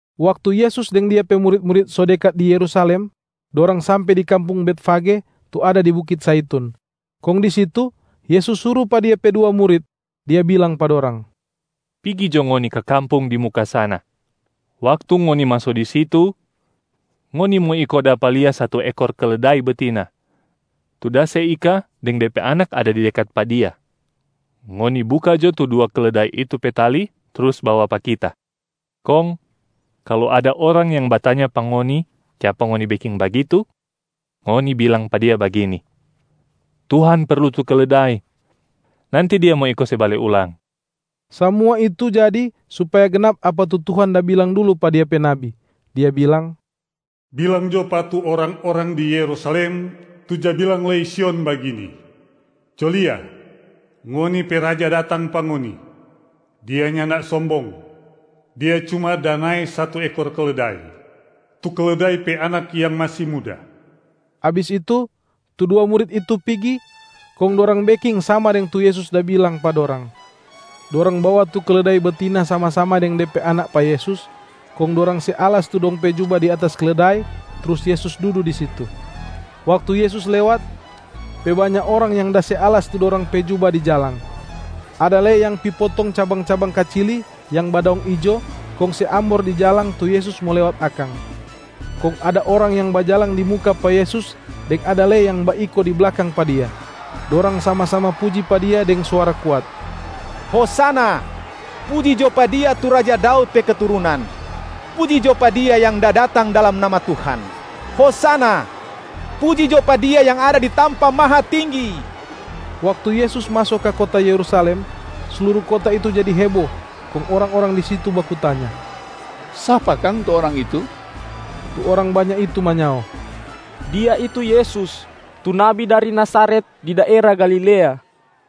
Waktu Yesus deng Dia pe murit-murit so dekat di Yerusalem, dorang sampe di kampung Betfage tu ada di Bukit Zaitun. Kong di situ Yesus suru pa Dia pe dua murit, Dia bilang pa dorang, “Pigi jo ngoni ka kampung di muka sana. Waktu ngoni maso di situ, ngoni mo iko dapa lia satu ekor keledai betina tu da se ika deng de pe anak ada di dekat pa dia. Ngoni buka jo tu dua keledai itu pe tali trus bawa pa Kita. Kong kalu ada orang yang batanya pa ngoni kiapa ngoni beking bagitu, ngoni bilang pa dia bagini, ‘Tuhan perlu tu keledai, nanti Dia mo iko se bale ulang.’” Samua itu jadi supaya gnap apa tu Tuhan da bilang dulu pa Dia pe nabi, Dia bilang, “Bilang jo pa tu orang-orang di Yerusalem tu ja bilang lei Sion bagini, ‘Co lia, ngoni pe Raja datang pa ngoni. Dia nyanda sombong. Dia cuma da nae satu ekor keledai, tu keledai pe anak yang masi muda.’” Abis itu, tu dua murit itu pigi kong dorang beking sama deng tu Yesus da bilang pa dorang. Dorang bawa tu keledai betina sama-sama deng de pe anak pa Yesus, kong dorang se alas tu dong pe juba di atas keledai trus Yesus dudu di situ. Waktu Yesus lewat, pe banya orang yang da se alas tu dorang pe juba di jalang. Ada lei yang pi potong cabang-cabang kacili yang badaong ijo kong se ambor di jalang tu Yesus mo lewat akang. Kong ada orang yang bajalang di muka pa Yesus deng ada lei yang baiko di blakang pa Dia. Dorang sama-sama puji pa Dia deng suara kuat, “Hosana! Puji jo pa Dia tu raja Daud pe keturunan! Puji jo pa Dia yang da datang dalam nama Tuhan. Hosana! Puji jo pa Dia yang ada di tampa mahatinggi!” Waktu Yesus maso ka kota Yerusalem, sluru kota itu jadi hebo, kong orang-orang di situ baku tanya, “Sapa kang tu orang itu?” Tu orang banya itu manyao, “Dia itu Yesus, tu nabi dari Nazaret di daera Galilea!”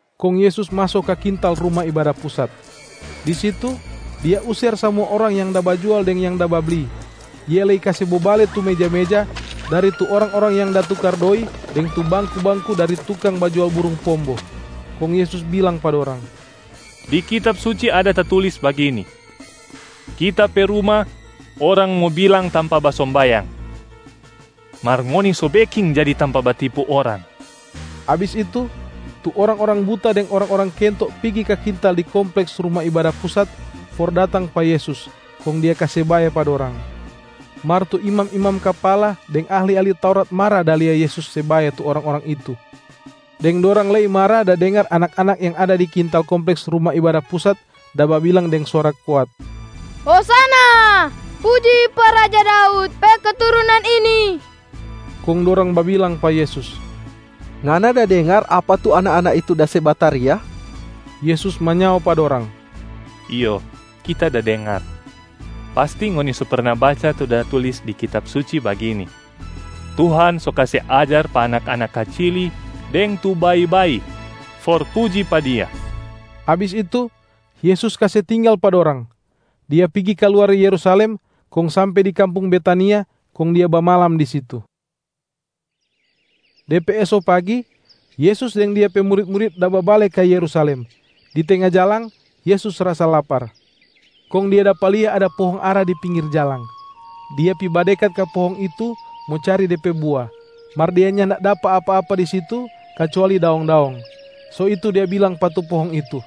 Kong Yesus maso ka kintal Ruma Ibada Pusat. Di situ Dia user samua orang yang da bajual deng yang da babli, Dia lei kase bobale tu meja-meja dari tu orang-orang yang da tukar doi deng tu bangku-bangku dari tukang bajual burung pombo. Kong Yesus bilang pa dorang, “Di Kitab Suci ada tatulis bagini, ‘Kita pe ruma orang mo bilang tampa basombayang.’ Mar ngoni so beking jadi tampa batipu orang!” Abis itu, tu orang-orang buta deng orang-orang kento pigi ka kintal di kompleks Ruma Ibada Pusat for datang pa Yesus, kong Dia kase bae pa dorang. Mar tu imam-imam kapala deng ahli-ahli Taurat mara da lia Yesus se bae tu orang-orang itu, deng dorang lei mara da dengar anak-anak yang ada di kintal kompleks Ruma Ibada Pusat da babilang deng suara kuat, “Hosana! Puji pa raja Daud pe keturunan ini!” Kong dorang babilang pa Yesus, “Ngana da dengar apa tu anak-anak itu da se bataria?” Yesus manyao pa dorang, “Iyo, Kita da dengar. Pasti ngoni so perna baca tu da tulis di Kitab Suci bagini, ‘Tuhan so kase ajar pa anak-anak kacili deng tu bayi-bayi for puji pa Dia.’” Abis itu, Yesus kase tinggal pa dorang. Dia pigi ka luar Yerusalem kong sampe di kampung Betania kong Dia bamalam di situ. De pe eso pagi, Yesus deng Dia pe murit-murit da babale ka Yerusalem. Di tenga jalang, Yesus rasa lapar. Kong Dia dapa lia ada pohong ara di pinggir jalang. Dia pi badekat ka pohong itu mo cari de pe bua, mar Dia nyanda dapa apa-apa di situ kacuali daong-daong. So itu Dia bilang pa tu pohong itu,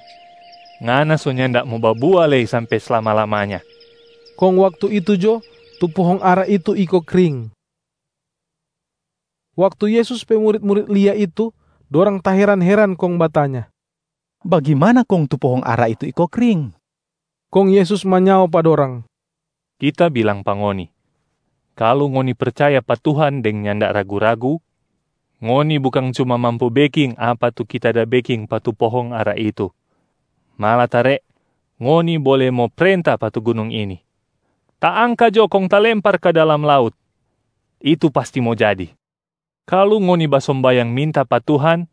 “Ngana so nyanda mo babua lei sampe slama-lamanya!” Kong waktu itu jo tu pohong ara itu iko kring. Waktu Yesus pe murit-murit lia itu, dorang taheran-heran kong batanya, “Bagimana kong tu pohong ara itu iko kring?” Kong Yesus manyao pa dorang, “Kita bilang pa ngoni, kalu ngoni percaya pa Tuhan deng nyanda ragu-ragu, ngoni bukang cuma mampu beking apa tu Kita da beking pa tu pohong ara itu, malatare ngoni bole mo prenta pa tu gunung ini, ‘Taangka jo kong talempar ka dalam laut!’ Itu pasti mo jadi. Kalu ngoni basombayang minta pa Tuhan,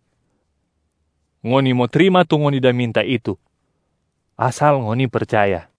ngoni mo trima tu ngoni da minta itu asal ngoni percaya.”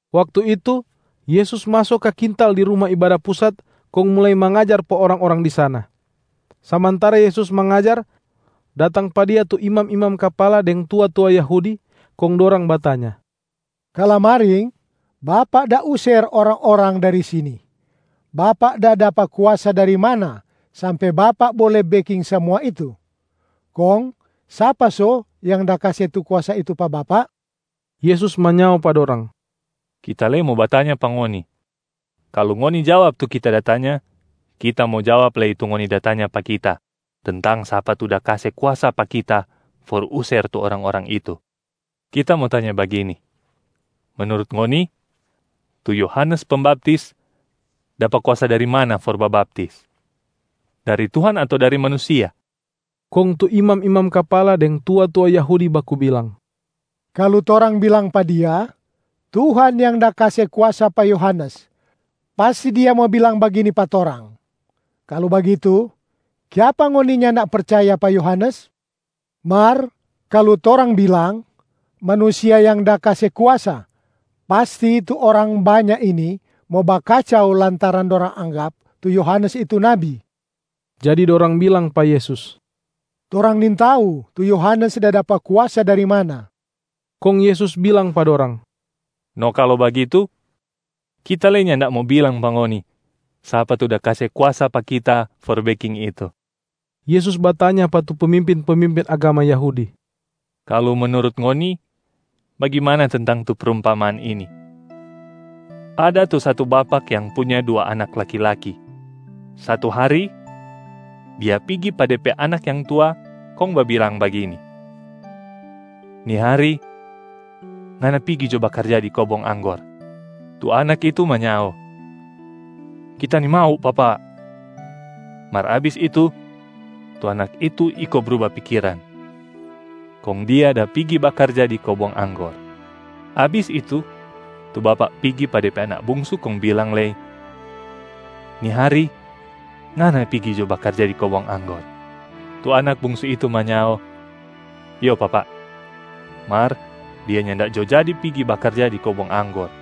Waktu itu, Yesus maso ka kintal di Ruma Ibada Pusat kong mulai mangajar pa orang-orang di sana. Samantara Yesus mangajar, datang pa Dia tu imam-imam kapala deng tua-tua Yahudi, kong dorang batanya, “Kalamaring, Bapak da user orang-orang dari sini. Bapak da dapa kuasa dari mana sampe Bapak bole beking samua itu? Kong sapa so yang da kase tu kuasa itu pa Bapak?” Yesus manyao pa dorang, “Kita lei mo batanya pa ngoni. Kalu ngoni jawab tu Kita da tanya, Kita mo jawab lei tu ngoni da tanya pa Kita tentang sapa tu da kase kuasa pa Kita for user tu orang-orang itu. Kita mo tanya bagini: menurut ngoni, tu Yohanes Pembaptis dapa kuasa dari mana for babaptis? Dari Tuhan ato dari manusia?” Kong tu imam-imam kapala deng tua-tua Yahudi baku bilang, “Kalu torang bilang pa Dia, ‘Tuhan yang da kase kuasa pa Yohanes’, pasti Dia mo bilang bagini pa torang, ‘Kalu bagitu, kiapa ngoni nyanda percaya pa Yohanes?’ Mar kalu torang bilang, ‘Manusia yang da kase kuasa’, pasti tu orang banya ini mo bakacau lantaran dorang anggap tu Yohanes itu nabi.” Jadi dorang bilang pa Yesus, “Torang nintau tu Yohanes da dapa kuasa dari mana!” Kong Yesus bilang pa dorang, “No kalu bagitu, Kita lei nyanda mo bilang pa ngoni sapa tu da kase kuasa pa Kita for beking itu.” Yesus batanya pa tu pemimpin-pemimpin agama Yahudi, “Kalu menurut ngoni, bagimana tentang tu prumpamaan ini: ada tu satu bapak yang punya dua anak laki-laki. Satu hari, dia pigi pa de pe anak yang tua kong babilang bagini, ‘Ni hari, ngana pigi jo bakarja di kobong anggor.’ Tu anak itu manyao, ‘Kita nimau papa,’ mar abis itu tu anak itu iko bruba pikiran, kong dia da pigi bakarja di kobong anggor. Abis itu, tu bapak pigi pa de pe anak bungsu kong bilang lei, ‘Ni hari, ngana pigi jo bakarja di kobong anggor.’ Tu anak bungsu itu manyao, ‘Iyo papa!’ mar dia nyanda jo jadi pigi bakarja di kobong anggor.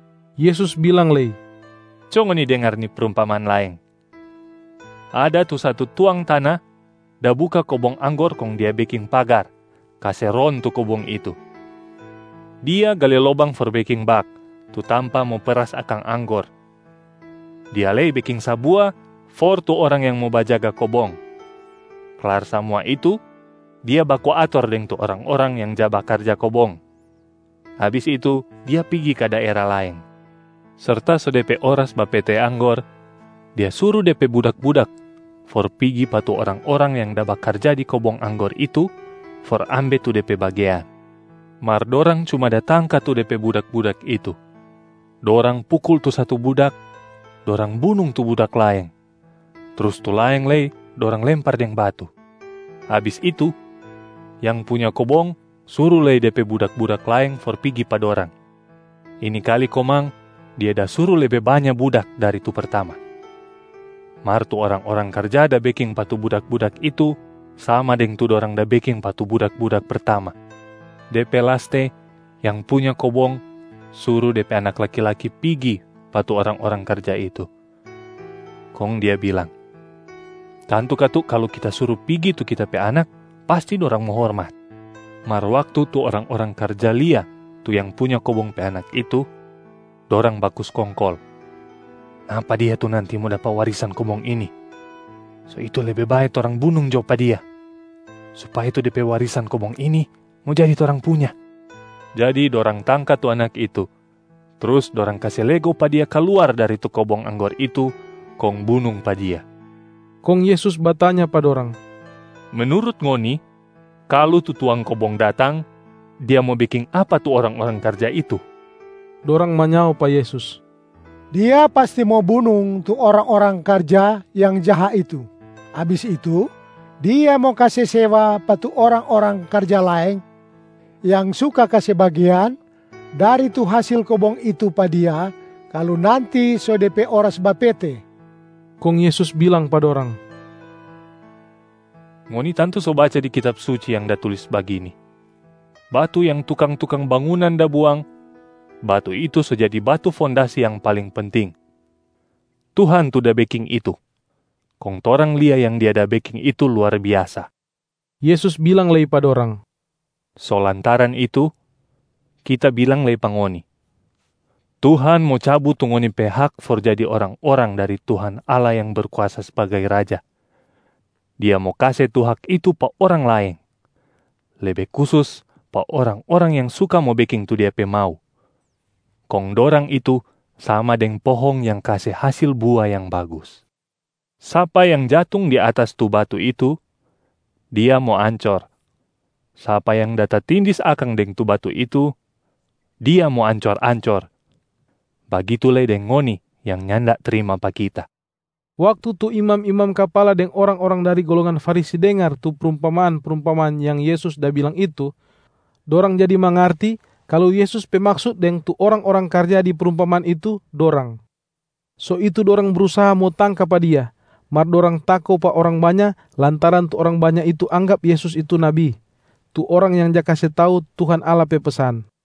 Yesus bilang lei, “Co ngoni dengar ni prumpamaan laeng. Ada tu satu tuang tana da buka kobong anggor kong dia beking pagar kase ron tu kobong itu. Dia gale lobang for beking bak, tu tampa mo peras akang anggor. Dia lei beking sabua for tu orang yang mo bajaga kobong. Klar samua itu dia baku ator deng tu orang-orang yang ja bakarja kobong. Abis itu, dia pigi ka daera laeng. Serta so de pe oras bapete anggor, dia suru de pe budak-budak for pigi pa tu orang-orang yang da bakarja di kobong anggor itu for ambe tu de pe bagean. Mar dorang cuma da tangka tu de pe budak-budak itu. Dorang pukul tu satu budak, dorang bunung tu budak laeng, trus tu laeng lei dorang lempar deng batu. Abis itu, yang punya kobong suru lei de pe budak-budak laeng for pigi pa dorang. Ini kali komang dia da suru lebe banya budak dari tu pertama. Mar tu orang-orang karja da beking pa tu budak-budak itu sama deng tu dorang da beking pa tu budak-budak pertama. De pe laste, yang punya kobong suru de pe anak laki-laki pigi pa tu orang-orang karja itu, kong dia bilang, ‘Tantu katu kalu kita suru pigi tu kita pe anak, pasti dorang mo hormat.’ Mar waktu tu orang-orang karja lia tu yang punya kobong pe anak itu, dorang baku skongkol, ‘Napa dia tu nanti mo dapa warisan kobong ini. So itu lebe bae torang bunung jo pa dia, supaya tu de pe warisan kobong ini mo jadi torang punya.’ Jadi dorang tangka tu anak itu, trus dorang kase lego pa dia kaluar dari tu kobong anggor itu kong bunung pa dia.” Kong Yesus batanya pa dorang, “Menurut ngoni, kalu tu tuang kobong datang, dia mo beking apa pa tu orang-orang karja itu?” Dorang manyao pa Yesus, “Dia pasti mo bunung tu orang-orang karja yang jaha itu. Abis itu, dia mo kase sewa pa tu orang-orang karja laeng yang suka kase bagean dari tu hasil kobong itu pa dia kalu nanti so de pe oras bapete.” Kong Yesus bilang pa dorang, “Ngoni tantu so baca di Kitab Suci yang da tulis bagini, ‘Batu yang tukang-tukang bangunan da buang, batu itu so jadi batu fondasi yang paling penting. Tuhan tu da beking itu, kong torang lia yang Dia da beking itu luar biasa.’” Yesus bilang lei pa dorang, “So lantaran itu, Kita bilang lei pa ngoni, Tuhan mo cabu tu ngoni pe hak for jadi orang-orang dari Tuhan Allah yang berkuasa sbagai Raja. Dia mo kase tu hak itu pa orang laeng, lebe kusus pa orang-orang yang suka mo beking tu Dia pe mau, kong dorang itu sama deng pohong yang kase hasil bua yang bagus. [ Sapa yang jatung di atas tu batu itu, dia mo ancor. Sapa yang da tatindis akang deng tu batu itu, dia mo ancor-ancor, bagitu lei deng ngoni yang nyanda trima pa Kita.]” Waktu tu imam-imam kapala deng orang-orang dari golongan Farisi dengar tu prumpamaan-prumpamaan yang Yesus da bilang itu, dorang jadi mangarti kalu Yesus pe maksut deng tu orang-orang karja di prumpamaan itu dorang. So itu dorang brusaha mo tangka pa Dia, mar dorang tako pa orang banya lantaran tu orang banya itu anggap Yesus itu nabi, tu orang yang ja kase tau Tuhan Allah pe pesan.